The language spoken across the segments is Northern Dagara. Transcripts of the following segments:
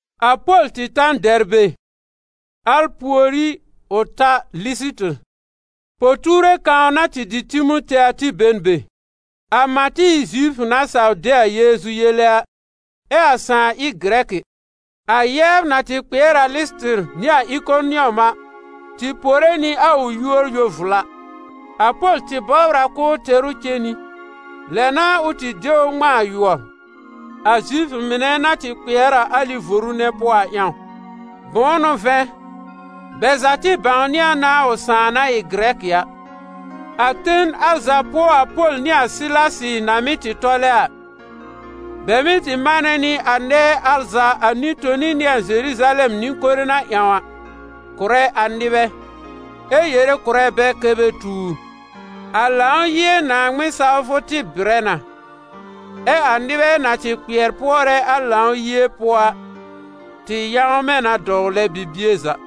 A Pol tɩ ta n Dɛrbe, al pùorí ʋ ta Lɩsɩtɩr. Po-tuure kãw na dɩ Timote a tɩ be n be. A mã tɩ ɩ n Zifʋ na saw de a Yeezu yele a, ɛ a sãà ɩ Gɩrɛkɩ. A yɛbr na tɩ kpɩɛr a Lɩsɩtɩr nɩ a Ɩkonɩɔm a tɩ pore nɩ a ʋ yúor yo-vla. A Pol tɩ bɔbr a k'ʋʋ tɛr ʋ cen nɩ, lɛ n'a ʋ tɩ de ʋ ŋmãa a yʋɔr, a Zifʋ mɩnɛ na tɩ kpɩɛr a alɩ voru nɛ pʋɔ a ƴãw. Bʋ̃ʋ n'ʋ vɛ̃, bɛ za tɩ bãwnɩ a na a ʋ sãà na ɩ Gɩrɛkɩ a. A ten al za pʋɔ a Pol nɩ a Sɩlasɩ na mɩ́ tɩ tɔlɛ a, bɛ mɩ́ tɩ manɛ nɩ a nɛɛ al za a nɩ-toni nɩ a Zeruzalɛm nɩ-kore na ƴãw a, kʋ̀rɛ a nɩbɛ, ɛ yere kʋ̀rɛ bɛ kɛ́ bɛ tuur. A Lãw-yie Naaŋmɩn sawfʋ tɩ bɩrɛ na, ɛ a nɩbɛ na tɩ kpɩɛr pʋɔrɛ a Lãw-yie pʋɔ a tɩ yãwmɛ̃ na dɔwlɛ bibie za.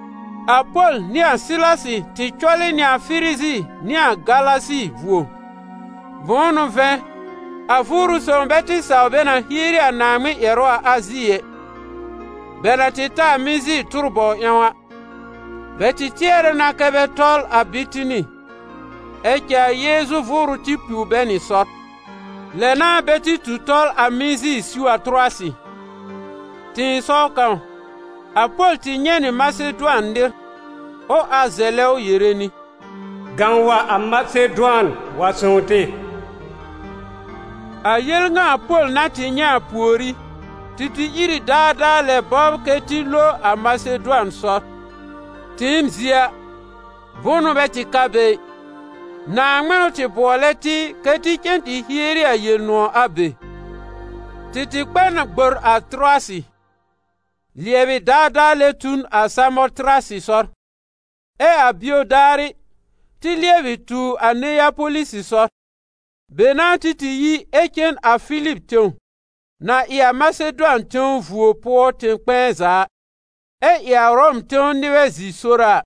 A Pol nɩ a Sɩlasɩ tɩ cɔlɩ nɩ a Firizi nɩ a Galasi vuo. Bʋ̃ʋ n'ʋ vɛ̃, a Vʋʋrʋ Sõw bɛ tɩ saw bɛ na hieri a Naaŋmɩn ƴɛrʋ a Azi ɛ. Bɛ na tɩ ta a Mizi tʋr-bɔw ƴãw a, bɛ tɩ tɩɛrɛ na kɛ bɛ tɔl a Bitini, ɛ cɛ a Yeezu Vʋʋrʋ tɩ piw bɛ nɩ sɔr. Lɛ n'a bɛ tɩ tu tɔl a Mizi siw a Tʋrʋwasɩ. Tɩ̃ɩsɔw kãw, a Pol tɩ nyɛ̃ nɩ Masedʋan nɩr, ʋ ar zɛlɛ ʋ yere nɩ: «Gãw wa a Masedʋan wa sõw tɩ!» A yel ŋa a Pol na tɩ nyɛ̃ a pùorí, tɩ tɩ ìr ɩ daadaa lɛ bɔbr kɛ tɩ lo a Masedʋan sɔr. Tɩɩm zie a, bʋnʋ bɛ tɩ ka be ɩ, Naaŋmɩn n'ʋ tɩ bʋɔlɛ tɩ kɛ́ tɩ cen tɩ hieri a Yel-nʋ̃ɔ̀ a be. Tɩ tɩ kpɛ n gbor a Tʋrʋwasɩ, lɩɛbɩ daadaa lɛ tu n a Samɔtɩrasɩ sɔr, ɛ a bio daarɩ, tɩ lɩɛbɩ tu a Neyapolisɩ sɔr. Be n'a tɩ tɩ yi ɛ cen a Filib tẽw, na ɩ a Masedʋan tẽw vuo pʋɔ tẽ-kpɛ̃ɛ za a, ɛ ɩ Ʋrɔm tẽw nɩbɛ zi-sora a.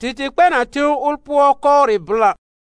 Tɩ tɩ kpɛ n a tẽw ʋl pʋɔ kɔwrɩ blã.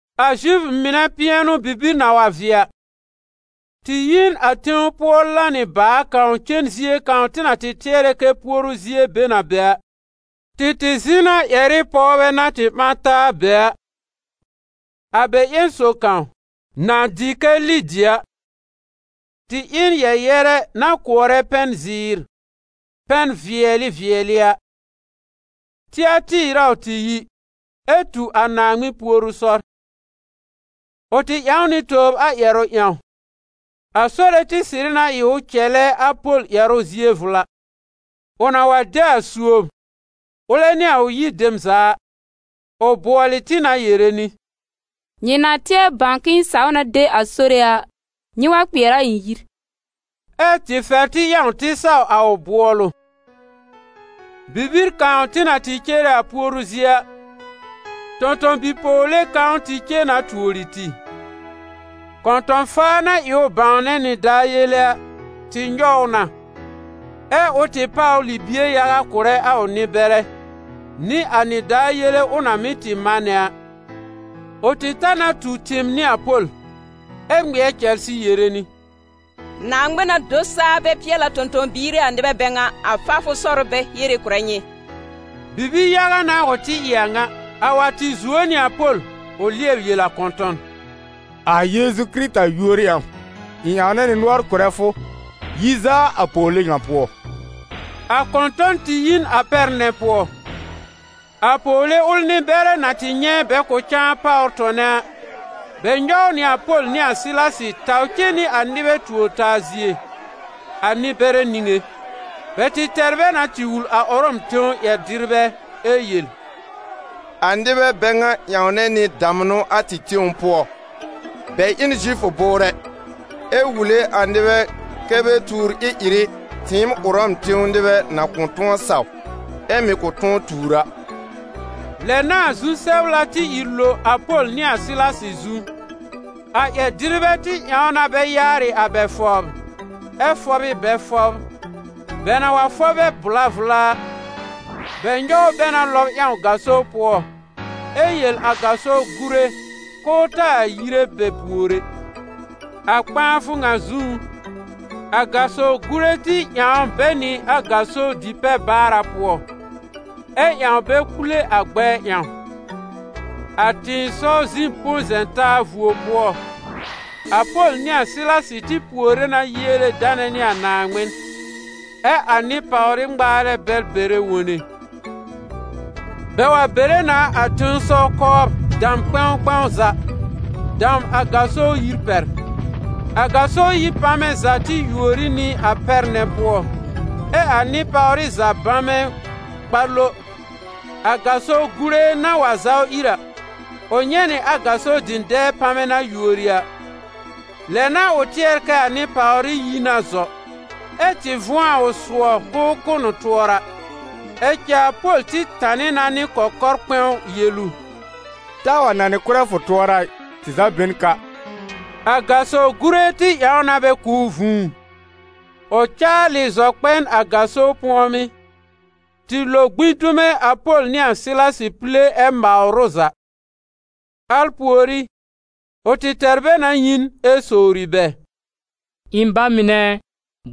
A Zifʋ mɩnɛ pɩɛnʋ-bibir na wa vɩɛ a, tɩ yi n a tẽw pʋɔ lanɩ baà kãw cen zie kãw tɩ na tɩɛrɛ kɛ puoru zie be n a be a. Tɩ tɩ zɩ̃ na ƴɛr ɩ pɔwbɛ na tɩ ɓã taa a be a. A bɛ ƴẽn sob kãw, na dɩ kɛ Lidi a, tɩ ɩ n yɛ-yɛrɛ na kʋɔrɛ pɛn-zɩɩr, pɛn-vɩɛlɩ vɩɛlɩ a; Tɩatɩɩr a ʋ tɩ yi, ɛ tu a Naaŋmɩn puoru sɔr. Ʋ tɩ ƴãw nɩ tobr a ƴɛrʋ ƴãw, a Sore tɩ sɩrɩ na ɩ ʋ cɛlɛ a Pol ƴɛrʋ zie vla. Ʋ na wa de a suob, ʋlɛ nɩ a ʋ yir dem za a, ʋ bʋɔlɩ tɩ na yere nɩ: «Nyɩ na tɩɛr bãw k'ɩ̃ɩ saw na de a Sore a, nyɩ wa kpɩɛr a ɩ̃ yir.» Ɛ́ tɩ fɛr tɩ ƴãw tɩ saw a ʋ bʋɔlʋ. Bibir kãw tɩ na tɩ cere a puoru zie a, tõ-tõ-bi-pɔwle kãw tɩ cen na tuori tɩ: Kɔ̃tɔ̃-faa na ɩ ʋ bãwnɛ nɩdaar yele a, tɩ nyɔw ʋ na, ɛ ʋ tɩ páwr libie yaga kʋ̀rɛ a ʋ nɩ-bɛrɛ, nɩ a nɩdaar yele ʋ na mɩ́ tɩ manɛ a. Ʋ tɩ ta na tu tɩɩm nɩ a Pol, ɛ ŋmɩɛr cɛlsɩ yere nɩ: «Naaŋmɩn-na-do-saa-bɛ-pɩɛl-a tõ-tõ-biir ɩ a nɩbɛ bɛ ŋa, a faafʋ sɔr ʋ bɛ hiere kʋ̀rɛ nyɩ.» Bibi-yaga n'a ʋ tɩ ɩ a a ŋa. A wa tɩ zuo nɩ a Pol ʋ lɩɛb yel a kɔ̃tɔ̃n: «A Yeezu Kɩrɩta yúor ƴãw, ɩ̃ ƴãwnɛ nɩ nʋɔr kʋ̀rɛ fʋ: yi zaa a pɔwle ŋa pʋɔ!» A kɔ̃tɔ̃n tɩ yi n a pɛr nɛ pʋɔ. A pɔwle ʋl nɩ-bɛrɛ na tɩ nyɛ̃ bɛ kʋ̃ cãa páwr tɔnɛ a, bɛ nyɔw nɩ a Pol nɩ a Sɩlasɩ taw cen nɩ a nɩbɛ tuor-taa zie, a nɩ-bɛrɛ niŋé. Bɛ tɩ tɛr bɛ na tɩ wul a Ʋrɔm tẽw ƴɛr-dɩrbɛ ɛ yel: «A nɩbɛ bɛ ŋa ƴãwnɛ nɩ damnʋ a tɩ tẽw pʋɔ. Bɛ ɩ n Zifʋ bʋʋrɛ, ɛ wule a nɩbɛ kɛ́ bɛ tuur ɩ-ɩrɩ tɩɩm Ʋrɔm tẽw nɩbɛ na kʋ̃ tʋ̃ɔ saw ɛ mɩ̀ kʋ̃ tʋ̃ɔ tuur a.» Lɛ n'a a zu-sɛbla tɩ ìr lo a Pol nɩ a Sɩlasɩ zu. A ƴɛr-dɩrbɛ tɩ ƴãw na bɛ yaarɩ a bɛ fɔbr ɛ fɔb ɩ bɛ fʋbr. Bɛ na wa fɔb bɛ vla vla a, bɛ nyɔw bɛ na lɔb ƴãw gaso pʋɔ ɛ yel a gaso gùre k'ʋʋ taa yire bɛ pùor ɛ. A kpãafʋ ŋa zũú, a gaso gùre tɩ ƴãw bɛ nɩ a gaso di-pɛ-baara pʋɔ, ɛ ƴãw bɛ kpule a gbɛɛ ƴãw. A tɩ̃ɩsɔw zi-po-zɛ̃-taa vuo pʋɔ, a Pol nɩ a Sɩlasɩ tɩ puore na yiele danɛ nɩ a Naaŋmɩn, ɛ a nɩ-pàwrɩ ŋmaarɛ bɛl bɛrɛ wone. Bɛ wa bere na a tẽsɔw kɔbr dam kpɛ̃w kpɛ̃w za, dam a gaso yir pɛr. A gaso yir pamɛ za tɩ yuori nɩ a pɛr nɛ pʋɔ, ɛ a nɩ-pàwrɩ za bamɛ kpa lo. A gaso gùre na wa zaw ìr a, ʋ nyɛ̃ nɩ a gaso dɩ̃dɛɛ pamɛ na yuori a, lɛ n'a ʋ tɩɛr kɛ a nɩ-pàwrɩ yi na zɔ, ɛ tɩ vʋ̃ɔ a ʋ sʋɔ k'ʋʋ kʋ́ n ʋ tʋɔra. Ɛ cɛ a Pol tɩ tanɩ na nɩ kɔkɔr kpɛ̃w yel ʋ: «Taa wa nanɩ kʋ́rɛ fʋ tʋɔra ɩ, tɩ za be n ka!» A gaso gùre tɩ ƴãw na bɛ kʋ̀ ʋ vũu, ʋ caalɩ zɔ tɩ kpɛ n a gaso pʋ̃ɔmɩ́, tɩ lo gbĩ dume a Pol nɩ a Sɩlasɩ pile ɛ mawr ʋ za. Al pùorí, ʋ tɩ tɛr bɛ na yi n ɛ sowri bɛ: «Ɩ̃ ba mɩnɛ ɛ,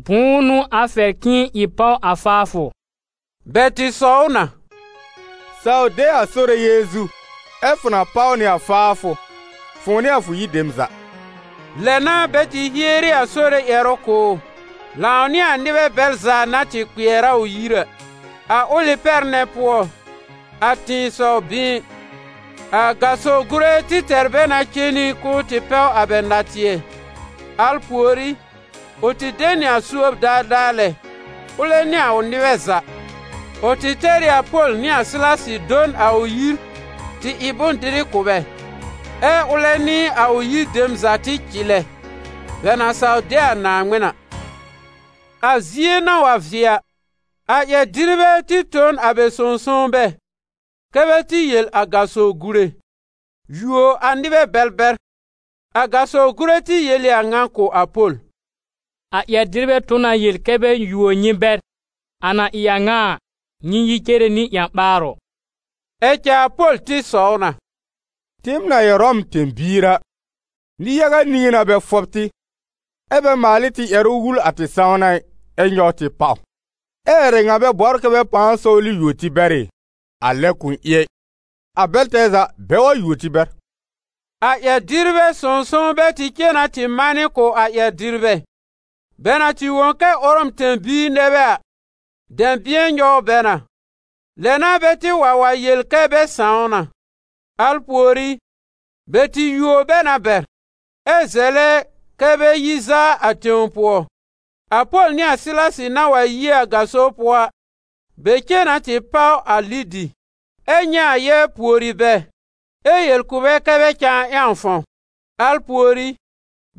bʋ̃ʋ n'ʋ a fɛr k'ɩ̃ɩ ɩ páw a faafʋ?» Bɛ tɩ sɔw ʋ na: «Saw de a Sore Yeezu ɛ fʋ na páw nɩ a faafʋ, fʋ̃ʋ nɩ a fʋ yir dem za.» Lɛ n'a bɛ tɩ hieri a Sore ƴɛrʋ kʋ̀ ʋ, lãw nɩ a nɩbɛ bɛl za na tɩ kpɩɛr a ʋ yir a. A ʋlɩ pɛr nɛ pʋɔ, a tɩ̃ɩsɔw-bɩ̃ɩn, a gaso gùre tɩ tɛr bɛ na cen nɩ k'ʋʋ tɩ pɛw a bɛ natɩɛ; al pùorí, ʋ tɩ de nɩ a suob daadaa lɛ, ʋlɛ nɩ a ʋ nɩbɛ za. Ʋ tɩ tɛr ɩ a Pol nɩ a Sɩlasɩ do n a ʋ yir tɩ ɩ bʋ̃-dɩrɩ kʋ̀ bɛ, ɛ́ ʋlɛ nɩ a ʋ yir dem za tɩ cɩlɛ, bɛ na saw de a Naaŋmɩn a. A zie na wa vɩɛ a, a ƴɛr-dɩrbɛ tɩ tõ n a bɛ sõw-sownbɛ kɛ́ bɛ tɩ yel a gaso gùre: «Yuo a nɩbɛ bɛl bɛr!» A gaso gùre tɩ yel ɩ a ŋa kʋ̀ a Pol: «A ƴɛr-dɩrbɛ tõ na yel kɛ́ bɛ yuo nyɩ bɛr. A na ɩ a ŋa a, nyɩ yi cere nɩ ƴã-ɓaarʋ!» Ɛ cɛ a Pol tɩ sɔw na: «Tɩɩm na ɩ Ʋrɔm tẽ-biir a, nɩ-yaga niŋé n'a bɛ fɔb tɩ, ɛ́ bɛ maal ɩ tɩ ƴɛrʋ wul a tɩ sãwna ɩ, ɛ nyɔw tɩ pàw. Ɛ ƴɛrɛ ŋa bɛ bɔbr kɛ bɛ pãa sɔwlɩ yuo tɩ bɛr ɩ? A lɛ kʋ̃ ɩ ɛ! A bɛl tɛɛ za, bɛ wa yuo tɩ bɛr!» A ƴɛr-dɩrbɛ sõw-sownbɛ tɩ cen na tɩ manɩ kʋ̀ a ƴɛr-dɩrbɛ. Bɛ na tɩ wõ kɛ Ʋrɔm tẽ-biir nɛ bɛ a, dɛ̃bɩ̃ɛ nyɔw bɛ na. Lɛ n'a bɛ tɩ wa wa yel kɛ bɛ sãw na. Al pùorí bɛ tɩ yuo bɛ na bɛr, ɛ zɛlɛ kɛ́ bɛ yi zaa a tẽw pʋɔ. A Pol nɩ a Sɩlasɩ na wa yi a gaso pʋɔ a, bɛ cen na tɩ páw a Lidi, ɛ nyɛ̃ a yɛbr pùori bɛ ɛ yel kʋ̀ bɛ kɛ bɛ cãa ƴãw fãw. Al pùorí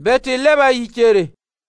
bɛ tɩ lɛb a yi cere.